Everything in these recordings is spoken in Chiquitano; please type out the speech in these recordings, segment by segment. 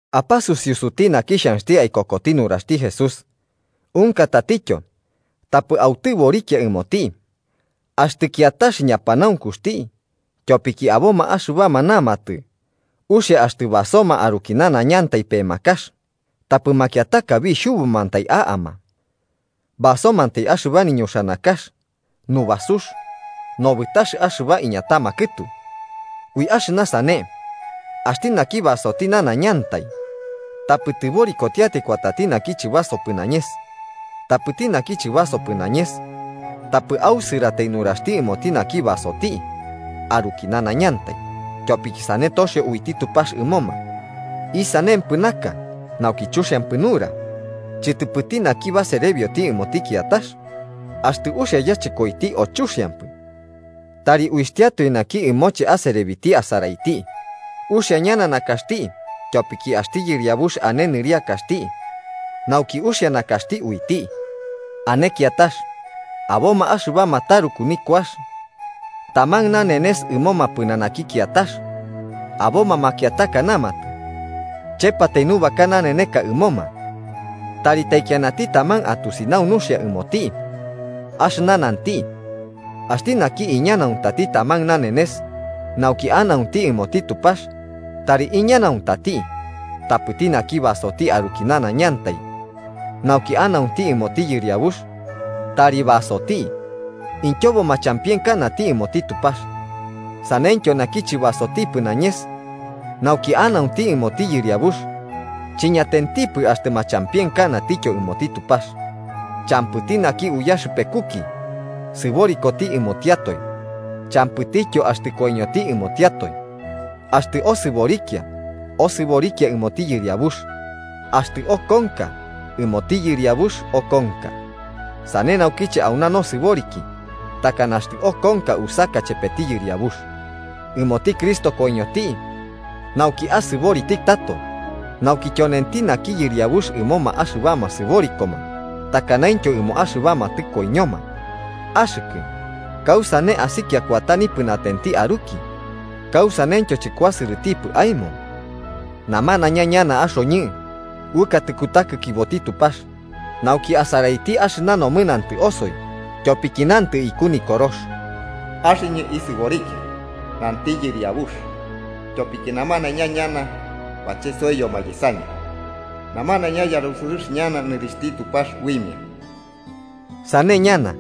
Apasusiusuti naki xhanxti aikokoti nuraxti Jesús unka tatityo, tapɨ autɨborikia ɨmoti, axtɨ kiatax ñapanaunkuxti. Tyopiki aboma axɨbama namatɨ uxia axtɨ basoma aruki nanaiñantai pemakax, tapɨ makiataka bixhubumantai a'ama, basomantai axɨba niñuxanakax nubasux nobɨtax axɨba iñatama kɨtu. Ui axɨna sane, axti naki basoti nanaiñantai tapɨ tɨborikotiatai kuatati naki chɨbasopɨ nañes. Tapɨti naki chɨbasopɨ nañes, tapɨ ausɨratai nuraxti ɨmoti naki basoti aruki nanañantai, tyopiki sane toxio uiti Tupax ɨmoma. ¿Isanempɨ naka nauki chuxiampɨ nura chɨtɨpɨti naki baserebioti ɨmoti kiatax? Axtɨ uxia yachɨkoiti o chuxiampɨ. Tari uitiatoe naki ɨmoche aserebiti asaraiti. Uxia ñana nakaxti tyopiki axti Yɨriabux ane nɨriakaxti nauki uxia nakaxti uiti. Ane kiatax: Aboma axɨbama taruku nikuax taman nanenes ɨmoma pɨnanaki kiatax, aboma makiataka namatɨ chepatai nubaka naneneka ɨmoma. Tari taikianati taman atusinau nuxia ɨmoti axɨna nanti. Axti naki iñanauntati taman nanenes, nauki anaunti ɨmoti Tupax tari iñanaunati. Tapɨti naki basoti aruki nanaiñantai, nauki anaunti ɨmoti Yɨriabux tari basoti, ityobo machampienkanati ɨmoti Tupax. Sanentityo naki chɨbasotipɨ nañes, nauki anaunti ɨmoti Yɨriabux chiñatentipɨ axtɨ machampienkanatityo ɨmoti Tupax. Champɨti naki uyaxɨpekuki sɨborikoti ɨmotiatoe, champɨityo axtɨ koiñoti ɨmotiatoe. Axtɨ osɨborikia, osɨborikia ɨmoti Yɨriabux. Axtɨ okonka, ɨmoti Yɨriabux okonka. Sane naukiche, auna nosɨboriki takana axtɨ okonka, usaka chepeti Yɨriabux. Ɨmoti Cristo koiñoti nauki asɨboriti tato: nauki tyonenti naki Yɨriabux ɨmoma axɨbama sɨborikoma takanaintyo ɨmo axɨbama tɨkoiñoma. Axɨkɨ, ¿kausane asikia kuata nipɨnatenti aruki? ¿Kausaneityo chɨkuasɨrɨtipɨ aemo? Namanaiña ñana axoñɨ uɨkatɨ kutakikiboti Tupax nauki asaraiti axɨna nomɨnantɨ osoi. Tyopiki nantɨ iku Nikorox: “Axɨñɨ isɨborikia, nanti Yɨriabux, tyopiki namanaiña ñana bachesoiyoma yesañɨ, namanaiña yarusɨrɨx ñana nɨrixhti Tupax uimia.” Sane ñana,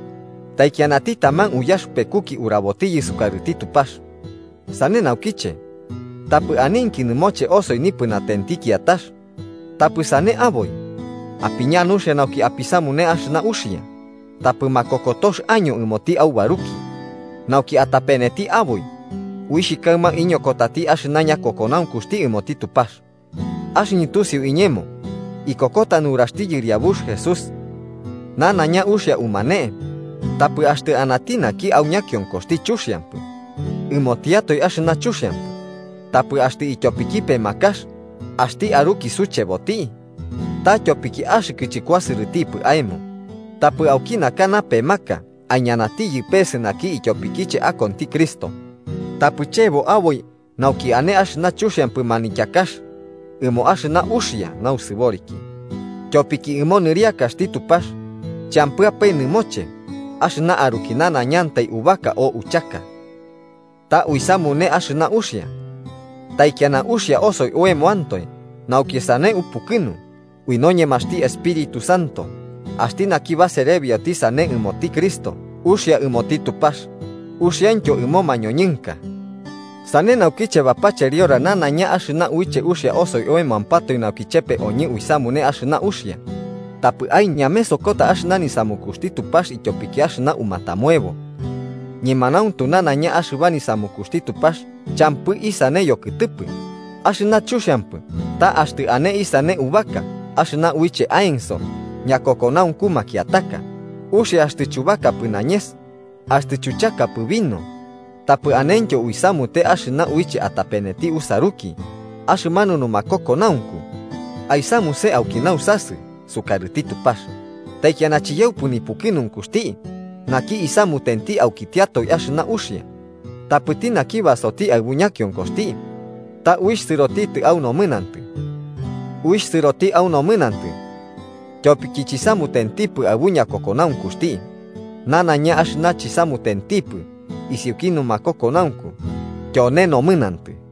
taikianati taman uyaxɨpekuki urabotiyɨ sukarɨti Tupax. Sane naukiche, tapɨ aninki nɨmoche osoi nipɨnatenti kiatax, tapɨ sane aboi, apiña nuxia nauki apisamune axɨna uxia tapɨ makokotox año ɨmoti aubaruki nauki atapeneti aboi, uixh kaɨma iñokotati axɨna ñakokonaunkuxti ɨmoti Tupax. Axɨñɨ tusiu iñemo ikokota nuraxti Yɨriabux Jesús, nanaiña uxia umane. Tapɨ axtɨ anati naki au ñakionkoxti chuxiampɨ, ɨmotiatae axɨna chuxiampɨ. Tapɨ axtɨ ityopiki pemakax axti aruki sucheboti, ta tyopiki axɨkɨ chɨkuasɨrɨtipɨ aemo. ¡Tapɨ auki naka napemaka aiñanatiyɨ pese naki ityopikiche akonti Cristo! Tapɨ chebo aboi nauki ane axɨna chuxiampɨ manityakax ɨmo axɨna uxia nausɨboriki. Tyopiki ɨmo nɨriakaxti Tupax champɨapae nɨmoche axɨna aruki nanaiñantai ubaka o uchaka, ta uisamune axɨna uxia, taikiana uxia osoi oemoantoe nauki sane upukɨnu ui noñemaxti Espíritu Santo. Axti naki baserebioti sane ɨmoti Cristo, uxia ɨmoti Tupax uxiaintyo ɨmo mañoñɨnka. Sane naukiche bapacheriora nanaiña axɨna uiche uxia osoi oemoampatoe nauki chepe oñɨ uisamune axɨna uxia. Tapɨ aiñamesokota axɨna nisamukuxti Tupax ityopiki axɨna aumatamuebo. Ñemanauntu nanaiña axɨba nisamukuxti Tupax champɨ isane yokɨtɨpɨ. Axɨna chuxiampɨ ta axtɨ ane isane ubaka axɨna uiche aenso ñakokonaunku makiataka. Uxia axtɨ chubakapɨ nañes axtɨ chuchakapɨ vino tapɨ anentyo uisamute axɨna uiche atapeneti usaruki. Axɨmanu nakokonaunku, aisamuse auki nausasɨ, sukarɨti Tupax. ¡Taikiana chiyaupɨ nipukɨnunkuxti naki isamutenti aukitiatoe axɨna uxia! Tapɨti naki basoti aɨbu ñakionkoxti ta uixh sɨroti au nomɨnantɨ, uixh sɨroti au nomɨnantɨ, tyopiki chisamutentipɨ aɨbu ñakokonaunkuxti. Nanaiña axɨna chuisamutempɨ isiuki numakokonaunku tyone nomɨnantɨ.